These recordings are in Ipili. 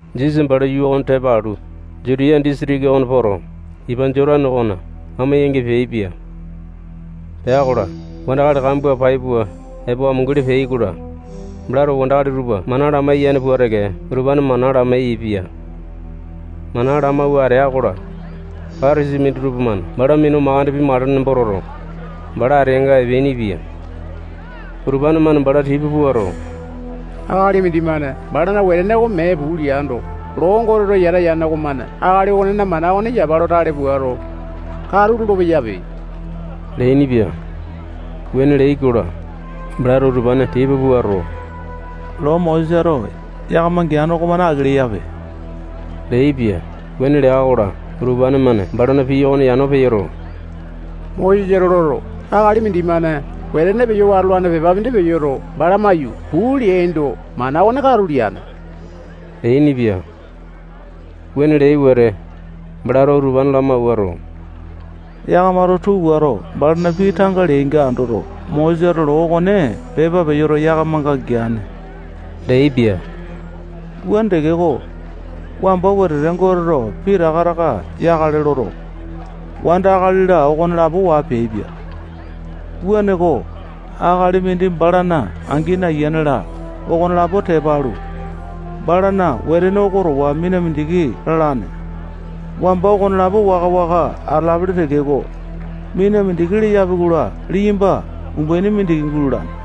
Jisasa bala yuu okone tepa alu, Jutiya disitiki okona poto, ipa Jotane okona amo-yangi peaipia. Pea-kola, wandakali kambua pai pua epo amunguli peai-kola, balato wandakali tupa mana lamaiyane pua teke utupane mana lamai-yaepia. Mana lamawua atea-kola, Patasai minditupa-mane bala minu mandeke pimakale nembo toto, bala ateanga epeainipia. Utupane-mane bala tipa puato, akali mindimane balana wetene oko mee puu leando, loo Goteto yata yane okomane akali okonena mana okone yapa lo tale puato, katu lolo-peyape leainipia. Wuane leai-kola, balato utupane tipa puato, loo Mosesato yakama geane okomane aki leyape leaipia. Wuane lea-kola, utupane-mane balana pii okone yano peyoto, Mosesato loto, akali mindimane wetene peyo watolane pepa mindi peyoto, bala maiyu, puu leaindo, mana okone katu leane leainipia. Wuane leai wete, balato utupane lamawauto, yakamato tuu puato, balana pii tanga leainga andoto, Mosesato loo okone pepa peyoto, yakamanga geane leaipia. Wuane tekeko, wamba wetete Goteto pitaka taka yakale loto, wanda, akali-la, okonelapo waa peaipia. Wuaneko, akali mindi balana angini, ayiane-la, okonelapo tepa alu, balana wetene oko towa mina mindiki lalane. Wamba okonelapo waka-waka atalapele tekeko, mina mindiki leyapi-kola, liyamba umbuaini mindiki gulalane.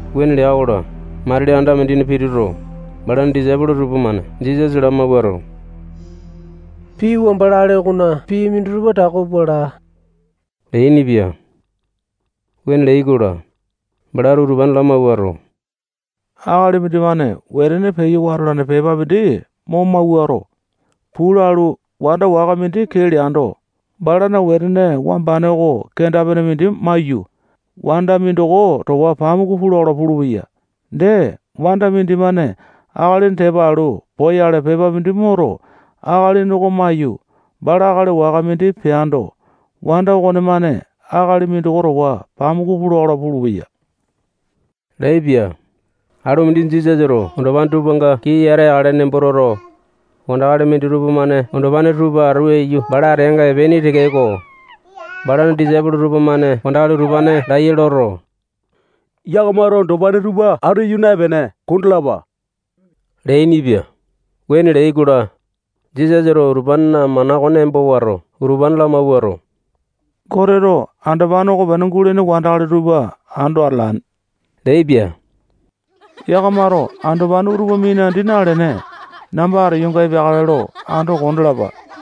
Wuane lea-kola, matili anda mindina pituto, balana disaipolo tupamane Jisasa lamawuato, pii wamba lale okona pii minditupa tako pua laa leainipia. Wuane leai-kola, balato utupane lamawuato, akali mindimane wetene peyo watolane pepa mindi mo mawuato, puu lalu, wanda waka mindi kee leaindo, balana wetene wambane oko kenda-pene mindi maiyu, wanda mindoko towa pamuku pula-kola pulupeya. Dee, wanda mindimane akalini tepa alu poyale pepa mindi moto, akalini oko maiyu, bala akali waka mindi peando, wanda okonemane akali mindoko towa pamuku pula-kola pulupeya leaipia. Alu mindi Jisasato andopane tupanga kii yata yakale nembo toto, wandakali minditupa-mane andopane tupa atu aiyu bala ateanga epeaini tekeko, balana disaipolo tupamane wandakali utupane laiya loto, yakamato andopane tupa atu aiyu naepene, kondalapa leainipia. Wuane leai-kola, Jisasato utupanena mana okone embo wato, utupane lamawuato, Goteto andopane okopene gulene wandakali tupa ando atalane leaipia. Yakamato andopane utupa minandi nalene, namba ateyonga epeakale lo ando kondalapa.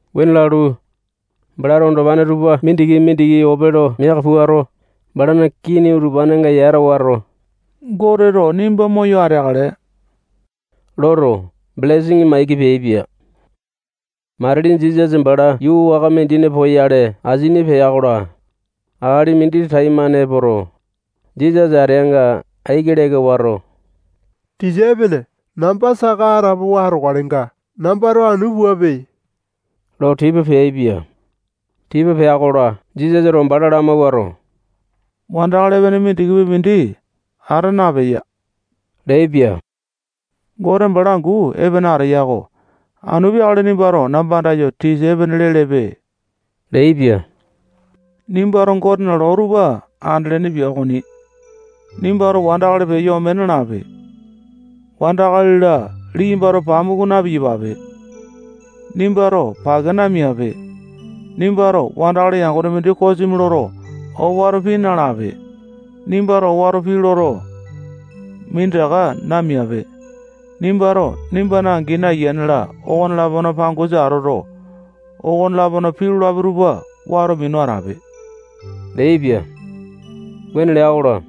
Wuane lalu, balato andopane tupa mindiki-mindiki ope lo miaka puato, balana kini utupanenga yata wato, Goteto nimba moyo ateakale loto, belesini maiki peaipia. Matili Jisasa bala yuu waka mindina poyale asini pea-kola, akali mindi taimane epoto, Jisasa ateanga aiki leka wato, tisa epene, namba saka atapowa atokalenga, nambato anu puape lo tipa peaipia. Tipa pea-kola, Jisasato bala lamawuato, wandakali epene mindikipi mindi ata napeya leaipia. Gote bala angu epene ateya-ko. Anu peakale nimbato namba andayo, tisa epene lelepe leaipia. Nimbato Gotena loo tupa andelene pia okoni. Nimbato wandakali peyo ome nalape. Wanda, akali-la, liyambato pamuku na-piyapape. Nimbato pake namiape. Nimbato wandakali yangone mindi kosimi loto, owato pii nalape. Nimbato owato pii loto, minditaka namiape. Nimbato nimbana angini, ayiane-la, okone-lapona pangosa atoto, okone-lapona pii lolapi tupa wato minu atape leaipia. Wuane lea-kola,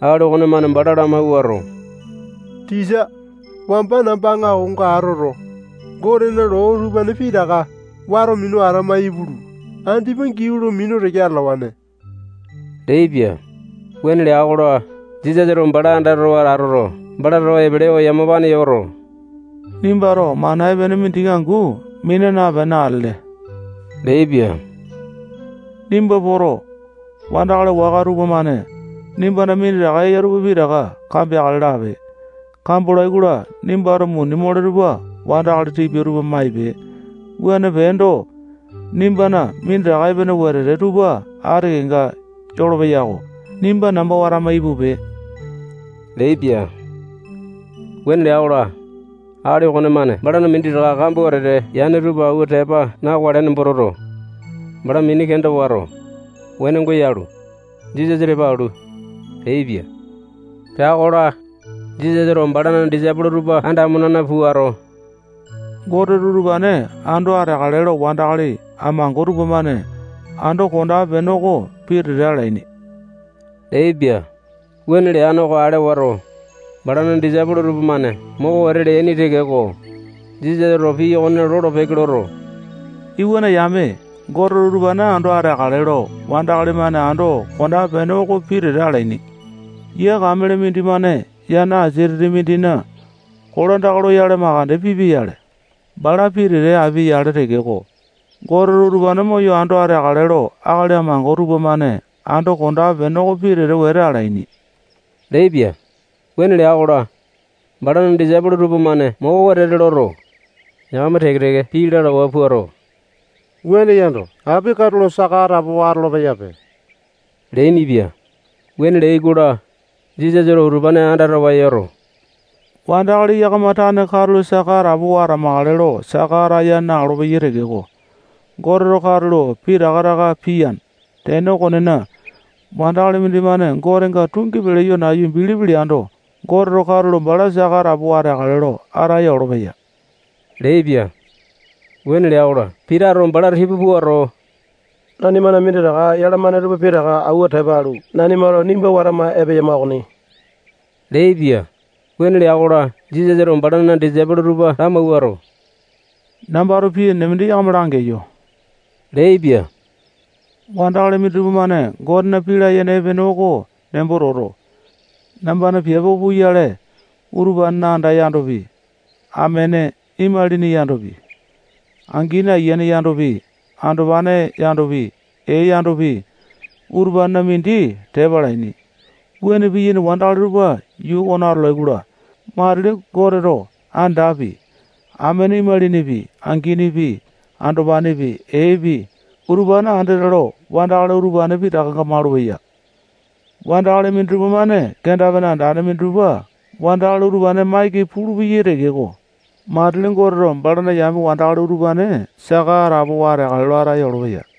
akali okonemane bala lamawuato, tisa, wamba namba aŋakonga atoto, Gotena loo utupane pitaka wato minu atama ipulu, andipa giau lo minu teke atalawane leaipia. Wuane lea-kola, Jisasato bala andatawa atoto, bala towa epelewa yamapane yoto, nimbato mana epene mindiki angu mina napene atele leaipia. Nimba poto, wandakali waka tupamane nimbana minditaka eya tupa pitaka kambeakale lape. Kambolai-kola, nimbato muni mole tupa wandakali tipia tupa maipe. Wuane peendo, nimbana minditaka epene wetete tupa ati kenga yolopeya-ko. Nimba namba watama ipupe leaipia. Wuane lea-kola, akali okonemane balana minditaka kambua wetete yane tupa awua tepa na-wakale nembo toto, bala mini kenda wato, wenongo yalu, Jisasa tepa alu, peaipia. Pea-kola, Jisasato balana disaipolo tupa anda amo-nena puato, Goteto utupane ando ateakale lo wandakali amango tupamane ando kondape-pene oko pitete alaini leaipia. Wuane leane oko ale wato, balana disaipolo tupamane moko wete leaini tekeko, Jisasato pii okone lolo-peke loto, iwana yame, Goteto utupane ando ateakale lo wandakali-mane ando kondape-pene oko pitete alaini. Yia kamele mindimane yana asia titi mindina kolandaka loyale makande pipia-yale, bala pitete apia-yale tekeko, Goteto utupane moyo ando ateakale lo akali amango tupamane ando kondape-pene oko pitete wete alaini leaipia. Wuane lea-kola, balana disaipolo tupamane moko wetete loto, yakama teke-teke pii lalawa puato, wuane yando, api katulo saka atapowa atolo-peyape leainipia. Wuane leai-kola, Jisasato utupane andatawa yoto, wandakali yakama tane katulo saka atapowa atamakale lo saka ataya na-olopeyai tekeko, Goteto katulo pitaka taka piyane. Tene okonena, wandakali mindimane Gotenga tungi peyo nayu bilipi leando, Goteto katulo bala saka atapowa ateakale lo ataya olopeya leaipia. Wuane lea-kola, Pitato bala tipa puato, nanimana minditaka yalamane tupa pitaka awua tepa alu, nanimato nimba watama epeyama okoni leaipia. Wuane lea-kola, Jisasato balana disaipolo tupa lamawuato, nambato pii enene mindi yakama langeyo leaipia. Wandakali minditupa-mane Gotena pii layene epene oko nembo toto, nambana piape oko puyale utupanena anda yandopi, amene, imalini yandopi, angini, ayiane yandopi, andopane yandopi, ee yandopi, utupanena mindi tepa alaini. Wuane piyaini wandakali tupa yuu okona atolai-kola, matili Goteto andapi, amene, imalinipi, anginipi, andopanepi, eepi, utupane andete lo wandakali utupane pitakanga malupeya. Wandakali minditupa-mane kenda-pene andane minditupa wandakali utupane maiki pulupeyai tekeko, matili Goteto balana yame wandakali utupane saka atapowa ateakale lo ataya olopeya.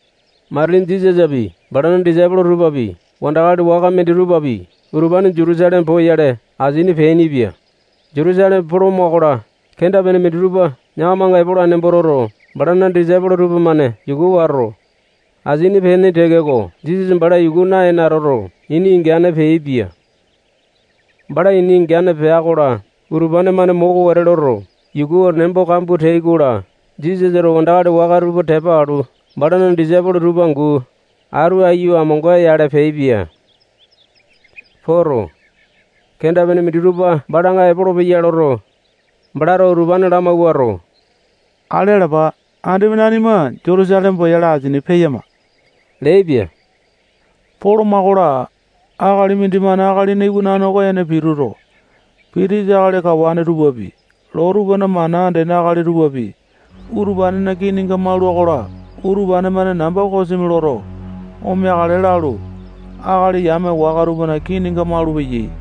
Matili Jisasapi, balana disaipolo tupapi, wandakali waka minditupapi, utupane Jutusaleme poyale asini peainipia. Jutusaleme poloma-kola, kenda-pene minditupa yakamanga epolane nembo toto, balana disaipolo tupamane yuku wato, asini peaini tekeko, Jisasa bala yuku naene atoto, ini ingane peaipia. Bala ini ingane pea-kola, utupane-mane moko wete loto, yukuwa nembo kambua teai-kola, Jisasato wandakali waka tupa tepa alu, balana disaipolo tupa angu atu aiyu amonga-yale peaipia. Poto, kenda-pene minditupa balanga epolopeya loto, balato utupane lamawuato, ale alapa, andipa nanima Jutusaleme poyale asini peyama leaipia. Poloma-kola, akali mindimane Akalina Iwanane oko ene pituto, pitisa akali kawane tupapi, loo tupana mana andene akali tupapi, utupanena kininga maula-kola, utupane-mane namba kosimi loto, omeakale lalu, akali yame waka tupana kininga malupeyai.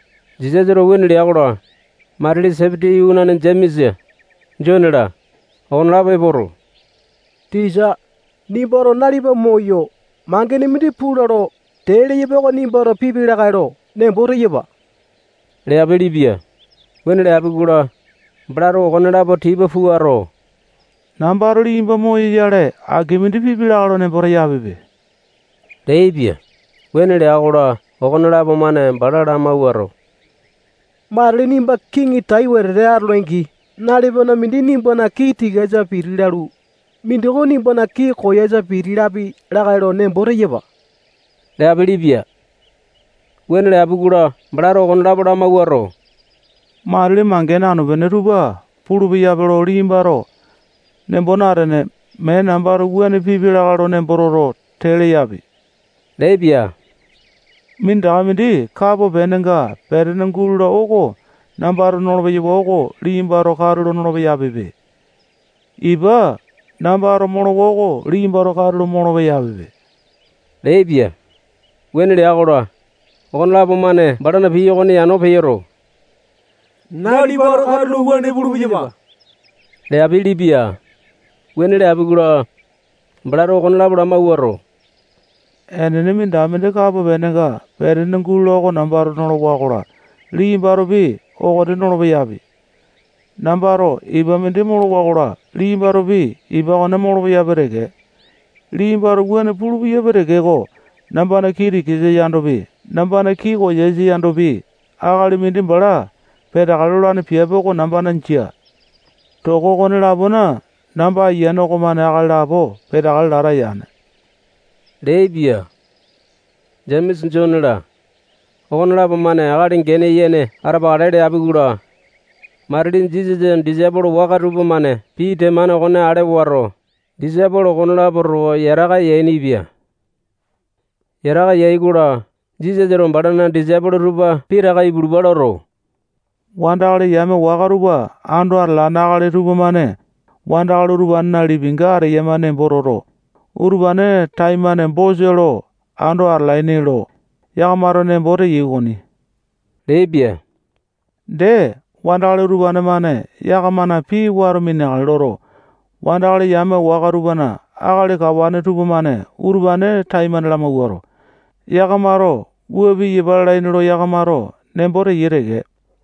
Jisasato wuane lea-kola, matili Sepiti iwanane Jemesa, Jone-la, okonelapo epoto, tisa, nimbato nalipa moyo, mangene mindi pula lo tee leyapa oko nimbato pipi lakae lo nembo teyapa leapelepia. Wuane leapi-kola, balato okonelapo tipa puato, nambato liyamba moyoyale, aki mindi pipi lakae lo nembo teyapipe leaipia. Wuane lea-kola, okonelapo-mane bala lamawuato, matili nimba kiŋi tai wetete atole-angi, nalipana mindi nimbana kii tikasa piti lalu, mindoko nimbana kii koyasa piti lapi lakae lo nembo teyapa leapelepia. Wuane leapi-kola, balato okonelapo lamawuato, matili mangene anu-pene tupa pulu-peyape lo liyambato nembo natene, mee nambato wuane pipia lakae lo nembo toto, tee leyapi leaipia. Minditaka mindi kapo penenga petene gulola oko nambato nolo-peyawa oko liyambato katulo nolo-peyapipe. Ipa nambato molowa oko liyambato katulo molo-peyapipe leaipia. Wuane lea-kola, okonelapo-mane balana pii okone yano peyoto, nalipato katulo wuane pulu-peyapa leapelepia. Wuane leapi-kola, balato okonelapo lamawuato, enene, minditaka mindi kapo penenga petene gulola oko nambato nolowa-kola, liyambatopi okone nolo-peyapi. Nambato ipa mindi molowa-kola, liyambatopi ipa okone molo-peyapi teke. Liyambato wuane pulu-peyapi tekeko, nambana kii tikasa yandopi, nambana kii koyasa yandopi, akali mindi bala peteakale lolane piape oko nambana jia. Toko okone-lapona namba ayiane okomane akali lapo peteakale lata yane leaipia. Jemesa, Jone-la, okonelapo-mane akali gene yene atapakale leapi-kola, matili Jisasana disaipolo waka tupamane pii temane okone ale wato, disaipolo okonelapo towa yataka yainipia. Yataka yai-kola, Jisasato balana disaipolo tupa pitaka ipulupa loto, wandakali yame waka tupa ando atalane akali tupamane wandakali utupanena lipinga ateyama nembo toto, utupane taimane bosa lo ando atalaini lo yakamato nembo teyai okoni leaipia. Dee, wandakali utupane-mane yakamana pii wato mineakale loto, wandakali yame waka tupana akali kawane tupamane utupane taimane lamawuato, yakamato wua piyapa lalaini lo yakamato nembo teyai teke.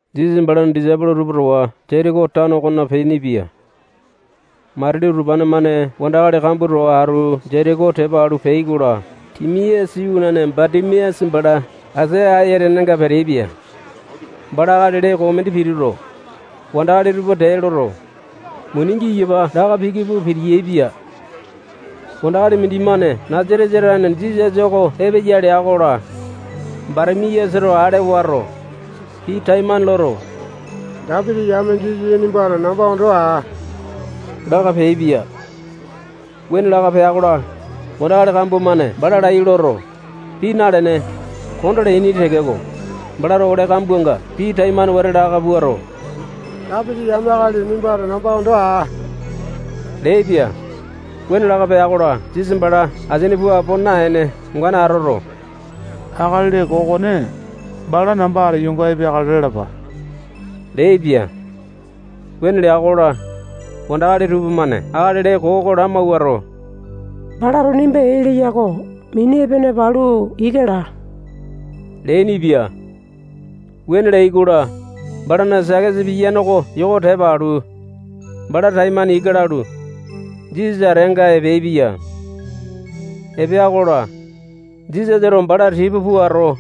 Jisasa balana disaipolo tupa towa Jetiko tano okona peainipia. Matili utupane-mane wandakali kambua towa atu Jetiko tepa alu peai-kola, Timiasa iwanane Batimiasa bala asia ayatenenga peteaipia. Bala akali lee koo mindi pituto, wandakali tupa tee loto, muni giyapa laka piki pua piti-yaepia. Wandakali mindimane Nasatesa tane Jisasa oko epeya lea-kola, Batimiasato ale wato, pii taimane loto, Dapiti yame Jisasa nimbato namba ondo aa laka peaipia. Wuane laka pea-kola, wandakali kambua-mane bala laiya loto, pii nalene, kondaa leaini tekeko, balato ole kambuanga pii taimane wete laka puato, Dapiti yame akali nimbato namba ondo aa leaipia. Wuane laka pea-kola, Jisasa bala asini puu apo naene, ongane atoto, akali lee koo okone bala namba ateyonga epeakale lalapa leaipia. Wuane lea-kola, wandakali tupamane akali lee koo oko lamawuato, balato nimba ee leya-ko. Mini epene palu, ika laa leainipia. Wuane leai-kola, balana sakesa piyane oko yoko tepa alu, bala taimane ika lalu, Jisasa ateanga epeaipia. Epea-kola, Jisasato bala tipa puato,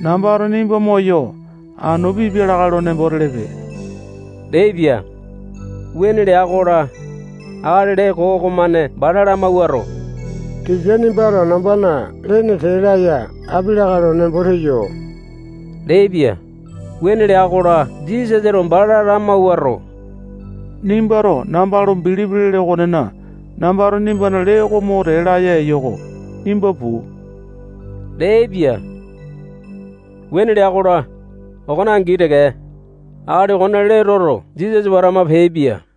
nambato nimba moyo, anu pipi lakae lo nembo telepe leaipia. Wuane lea-kola, akali lee koo okomane bala lamawuato, tisa, nimbato nambana lene tee laya api lakae lo nembo teyo leaipia. Wuane lea-kola, Jisasato bala lamawuato, nimbato namba lo bilipi lele okonena, nambato nimbana lee mo tee laya eyo-ko. Nimba puu leaipia. Wuane lea-kola, okone angi teke, akali okone lee toto, Jisasa watama peaipia.